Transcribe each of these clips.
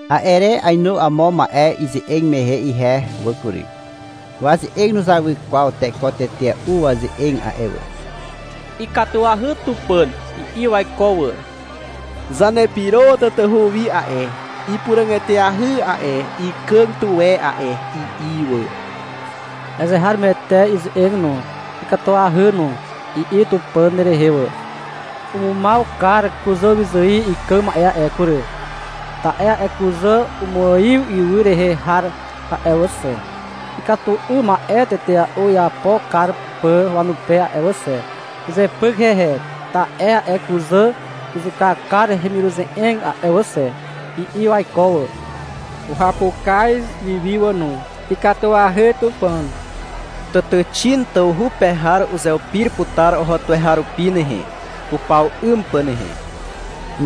A'e re ainu amo ma'e ize'eg mehe ihe wà kury. Waze'eg nuzawy kwaw teko tetea'u waze'eg a'e wà. — Ikatuahy Tupàn, i'i waiko wà. — Zanepyro tatahu wi a'e, ipuràg eteahy a'e, ikàg tuwe a'e, i'i wà. — Azeharomoete ize'eg no, ikatuahy no, i'i Tupàn rehe wà. — Umumaw kar kuzàwyzài ikàg ma'e a'e kury, ta'e a'e kuzà umuaiw ywy rehe har a'e wà xe, ikatu 'ym ma'e tetea'u iapo kar pà wanupe a'e wà xe. Uzepyk hehe, ta'e a'e kuzà uzuka kar hemiruze'eg a'e wà xe, i'i waiko wà. Uhapukaz wi wi wà no. — Ikatuahy Tupàn. Tàtàxin tawhu pe har uzeupir putar oho tuweharupi nehe, upaw 'ym pà nehe, i'i izupe wà.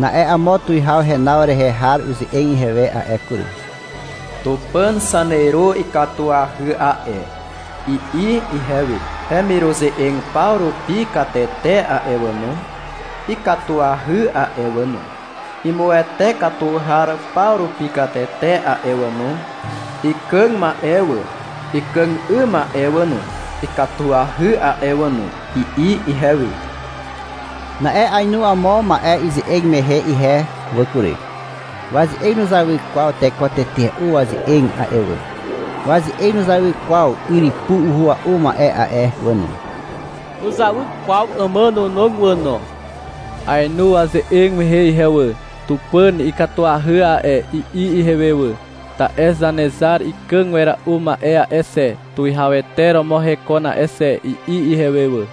Na'e amo tuwihaw henaw rehe har uze'eg ihewe a'e kury. — Tupàn zaneru ikatuahy a'e, i'i ihewe. — Hemiruze'eg paw rupi katete a'e wà no, ikatuahy a'e wà no. Imuwete katu har paw rupi katete a'e wà no, ikàg ma'e wà, ikàg 'ym ma'e wà no, ikatuahy a'e wà no, i'i ihewe. Na'e ainu amo ma'e ize'eg mehe ihe wà kury. Waze'eg nuzawy kwaw teko tetea'u waze'eg a'e wà. Waze'eg nuzawy kwaw yrypu uhua'u ma'e a'e wà no. Nuzawy kwaw àmànànog wà no. Aenu waze'eg mehe ihe wà. — Tupàn ikatuahy a'e, i'i ihewe wà. — Ta'e Zanezar ikàg wera'u ma'e a'e xe, tuwihawete romo hekon a'e xe, i'i ihewe wà.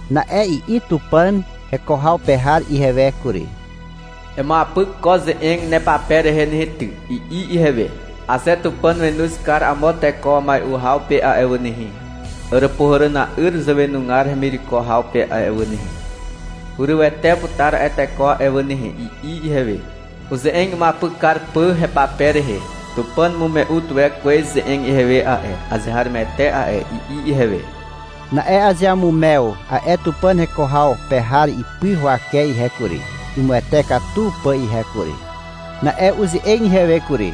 Na'e i'i Tupàn heko haw pe har ihewe kury. — Emuapyk ko ze'eg nepape rehe nehe ty, i'i ihewe. — Aze Tupàn wenoz kar amo teko mai'u haw pe a'e wà nehe, Àràpuhàràna'yr zàwenugar hemireko haw pe a'e wà nehe, hurywete putar a'e teko a'e wà nehe, i'i ihewe, uze'eg imuapyk kar pà hepape rehe. — Tupàn umume'u tuwe kwez ze'eg ihewe a'e, azeharomoete a'e, i'i ihewe. Na'e azeamumew a'e Tupàn heko haw pe har ipy huwake ihe kury, imuwete katu pà ihe kury. Na'e uze'eg ihewe kury.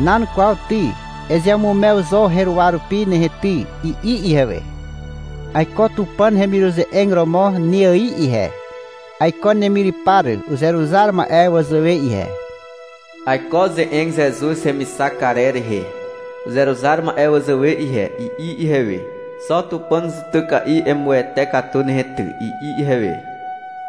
— Nan kwaw ty, ezeamumew zo heruwa rupi nehe ty, i'i ihewe. — Aiko Tupàn hemiruze'eg romo ne ài ihe, aiko nemyrypar uzeruzar ma'e wazàwe ihe. Aiko ze'eg Zezuz hemixak karer rehe uzeruzar ma'e wazàwe ihe, i'i ihewe. — Xo Tupàn zutyka'i emuwete katu nehe ty, i'i ihewe.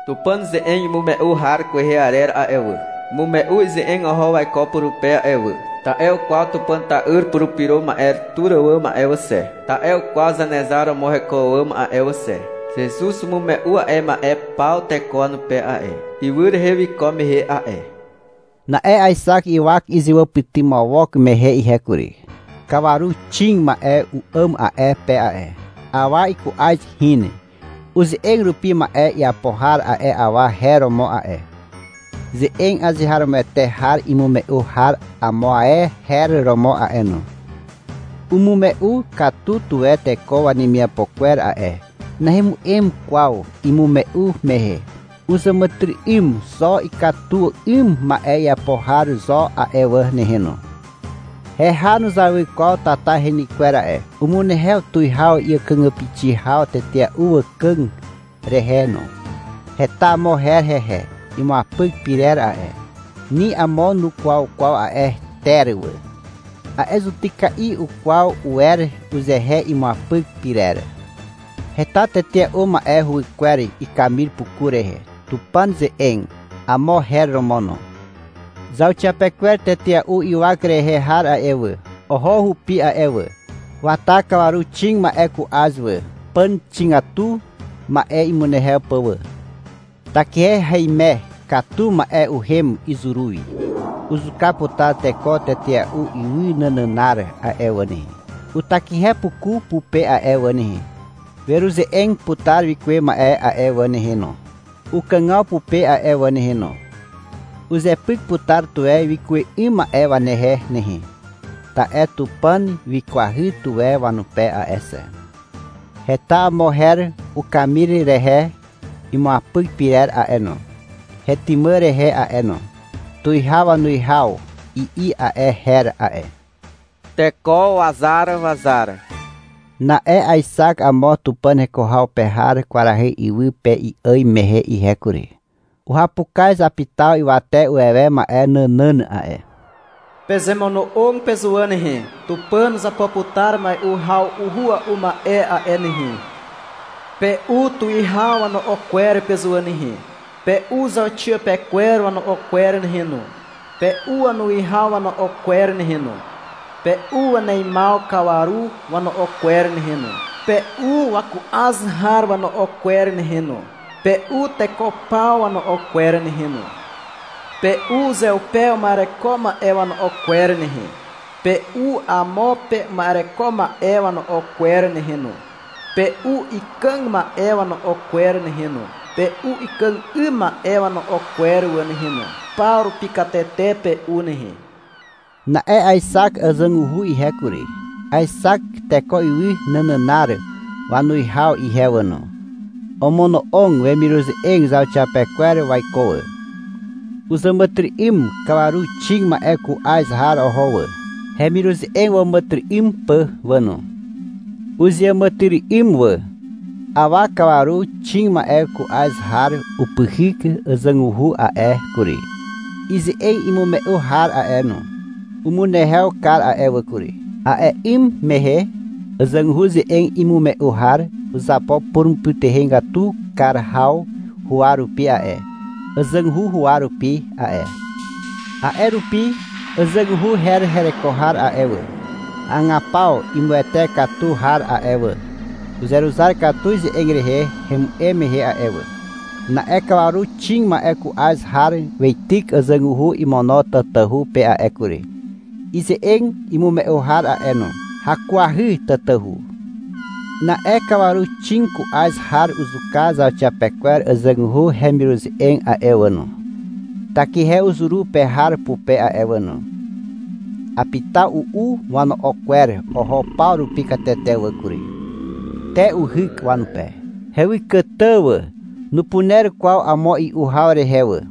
Tupàn ze'eg imume'u har kwehe arer a'e wà, umume'u ize'eg oho waiko purupe a'e wà, ta'e ukwaw Tupàn ta'yr Purupyro Ma'e tur àwàm a'e wà xe, ta'e ukwaw Zanezar romo heko àwàm a'e wà xe. Zezuz umume'u a'e ma'e paw teko wanupe a'e, ywy rehe wiko mehe a'e. Na'e aexak ywak izewàpytymawok mehe ihe kury. Kawaru xig ma'e u'àm a'e pe a'e. Awa iku'az hin. Uze'eg rupi ma'e iapo har a'e awa her romo a'e. Ze'eg azeharomoete har imume'u har amo ae her romo a'e no. Umume'u katu tuwe teko wanemiapo kwer a'e. Nahemu'em kwaw imume'u mehe. Uzàmàtyry'ym xo ikatu 'ym ma'e iapo har zo a'e wà nehe no. Heha nuzawy kwaw tata heny kwer a'e. Umunehew tuwihaw àkàgàpixi haw tetea'u wàkàg rehe no. Heta amo her hehe imuapyk pyrer a'e. Ni amo nukwaw kwaw a'e ter wà. A'e zutyka'i ukwaw uwer uzehe imuapyk pyrer. Heta tetea'u ma'e huwykwer ikamir puku rehe. Tupàn ze'eg, amo her romo no. Zauxiapekwer tetea'u ywak rehe har a'e wà, oho hupi a'e wà. Wata kawaru xig ma'e ku'az wà, pàn xigatu ma'e imunehew pà wà. Takihe haime katu ma'e uhem izuru wi. Uzuka putar teko tetea'u ywy nànànar a'e wà nehe, utakihe puku pupe a'e wà nehe. Weruze'eg putar wikuwe ma'e a'e wà nehe no, ukàgaw pupe a'e wà nehe no. Uzepyk putar tuwe wikuwe 'ym ma'e wanehe nehe, ta'e Tupàn wikwahy tuwe wanupe a'e xe. Heta amo her ukamir rehe imuapyk pyrer a'e no, hetymà rehe a'e no. — Tuwihaw wanuwihaw, i'i a'e her a'e. — Teko wazar wazar, i'i amo her no. Na'e aexak amo Tupàn heko haw pe har kwarahy iwy pe i'àm mehe ihe kury. Uhapukaz apitaw ywate uwewe ma'e nànàn a'e. — Pezemono'og pezuwà nehe, Tupàn uzapo putar mai'u haw uhua'u ma'e a'e nehe, i'i wanupe. — Pe'u tuwihaw wano'o kwer pezuwà nehe, pe'u zauxiapekwer wano'o kwer nehe no, pe'u wanuwihaw wano'o kwer nehe no, pe'u waneimaw kawaru wano'o kwer nehe no, pe'u waku'az har wano'o kwer nehe no, pe'u teko paw wano'o kwer nehe no, pe'u uzeupe uma'ereko ma'e wano'o kwer nehe, pe'u amo pe uma'ereko e ma'e wano'o kwer nehe no, pe'u ikàg ma'e wano'o kwer nehe no, pe'u ikàg 'ym ma'e wano'o kwer wà nehe no, paw rupi katete pe'u nehe, i'i apitaw wanupe. Na'e aexak àzàguhu ihe kury, aexak teko ywy nànànar wanuwihaw ihe wà no. Omono'og wemiruze'eg zauxiapekwer waiko wà. Uzàmàtyry'ym kawaru xig ma'e ku'az har oho wà, hemiruze'eg wàmàtyry'ym pà wà no. Uzeàmàtyry'ym wà. Awa kawaru xig ma'e ku'az har upyhyk àzàguhu a'e kury, ize'eg imume'u har a'e no. Umunehew kar a'e wà kury. (A'e 'ym mehe àzàguhu ze'eg imume'u har uzapo purumupytuhegatu kar haw huwa rupi a'e, àzàguhu huwa rupi a'e. A'e rupi àzàguhu her hereko har a'e wà, hagapaw imuwete katu har a'e wà, uzeruzar katu ize'eg rehe hemu'em mehe a'e wà.) Na'e kawaru xig ma'e ku'az har weityk àzàguhu imono tatahu pe a'e kury, ize'eg imume'u har a'e no. Hakuahy tatahu. Na'e kawaru xig ku'az har uzuka zauxiapekwer àzàguhu hemiruze'eg a'e wà no, takihe uzuru pe har pupe a'e wà no. Apitaw u'u wano'o kwer oho paw rupi katete wà kury. Te uhyk wanupe. Hewykàtà wà. Nupuner kwaw amo i'u haw rehe wà.